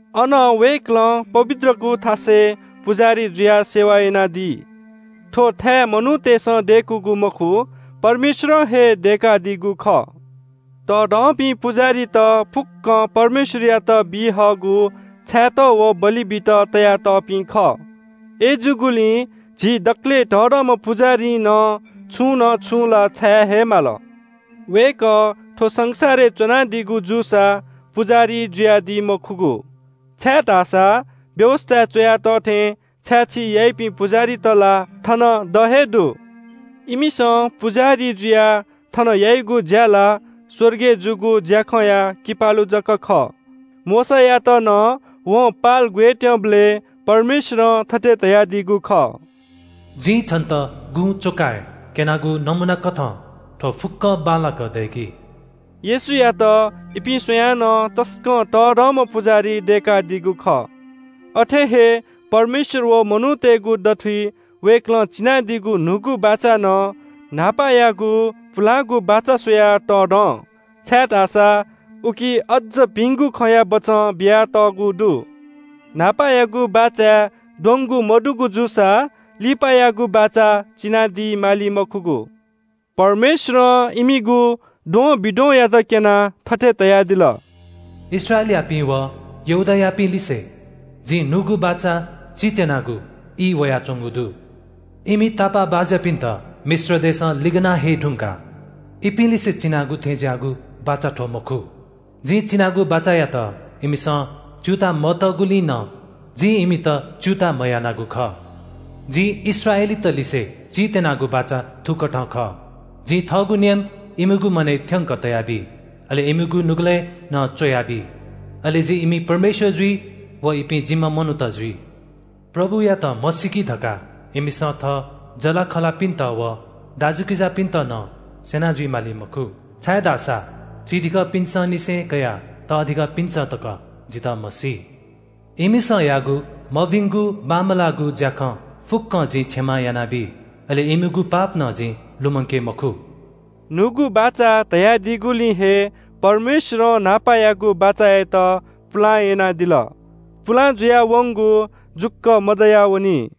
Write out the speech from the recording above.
अन वय्‌कलं पवित्रगु थासय् पुजाहारी जुयाः सेवा यानादी। थ्‍व थाय् मनूतय्‌सं दय्‌कूगु मखु, परमेश्‍वरं हे दय्‌कादीगु खः। तःधंपिं पुजाहारीत फुक्‍कं परमेश्‍वरयात बी हःगु छायेत व बलि बीत तयातःपिं खः। अय्‌जूगुलिं झी दकलय् तःधंम्‍ह पुजाहारीं नं छुं न छुं ला छाये हे माल। वय्‌कः थ्‍व संसारय् च्‍वनादीगु जूसा पुजाहारी जुयादी मखुगु, छाय्‌धाःसा व्‍यवस्‍थाय् च्‍वया तः थें छाय्‌छी याइपिं पुजाहारीत ला थन द हे दु। इमिसं पुजाहारी जुयाः थन याइगु ज्‍या ला स्‍वर्गय् जूगु ज्‍याखँया किपालु जक खः। मोशायात नं वं पाल ग्‍वयेत्‍यंबलय् परमेश्‍वरं थथे धयादीगु खः – “जिं छन्‍त गुँच्‍वकाय् क्‍यनागु नमूनाकथं थ्‍व फुक्‍कं बांलाक दय्‌कि।” येशूयात इपिं स्‍वयाः नं तसकं तःधंम्‍ह पुजाहारी दय्‌कादीगु खः। अथे हे परमेश्‍वर व मनूतय्‌गु दथुइ वय्‌कलं चिनादीगु न्‍हूगु बाचा नं न्‍हापायागु पुलांगु बाचा स्‍वयाः तःधं, छाय्‌धाःसा उकी अज्‍ज भिंगु खँया बचं बियातःगु दु। न्‍हापायागु बाचाय् द्वंगु मदुगु जूसा लिपायागु बाचा चिनादी माली मखुगु। परमेश्‍वरं इमिगु द्वंबिद्वंयात क्‍यनाः थथे धयादिल – “इस्राएलयापिं व यहूदायापिंलिसे जिं न्‍हूगु बाचा चीत्‍यनागु ई वयाच्‍वंगु दु। इमि तापाःबाज्‍यापिन्‍त मिश्र देशं लिगना हये धुंकाः इपिं लिसे चिनागु थें ज्‍याःगु बाचा थ्‍व मखु। जिं चिनागु बाचायात इमिसं च्‍यूताः मतःगुलिं नं जिं इमित च्‍यूताः मयानागु खः। जिं इस्राएलीतलिसे चीत्‍यनागु बाचा थुकथं खः – ‘जिं थःगु नियम इमिगु मनय् थ्‍यंक तयाबी, अले इमिगु नुगलय् नं च्‍वयाबी। अले जि इमि परमेश्‍वर जुइ व इपिं जिम्‍ह मनूत जुइ।’ ‘प्रभुयात म्‍हसीकी’ धकाः इमिसं थः जःलाखःलापिन्‍त व दाजुकिजापिन्‍त नं स्‍यना जुइ माली मखु, छाय्‌धाःसा चिधिकःपिन्‍संनिसें कयाः तःधिकःपिन्‍सं तकं जितः म्‍हसी। इमिसं याःगु मभिंगु बांमलाःगु ज्‍याखँ फुक्‍कं जिं क्षमा यानाबी, अले इमिगु पाप नं जिं लुमंके मखु।” न्‍हूगु बाचा धयादीगुलिं हे परमेश्‍वरं न्‍हापायागु बाचायात पुलां यानादिल। पुलां जुयावंगु जुक्‍व मदयावनी।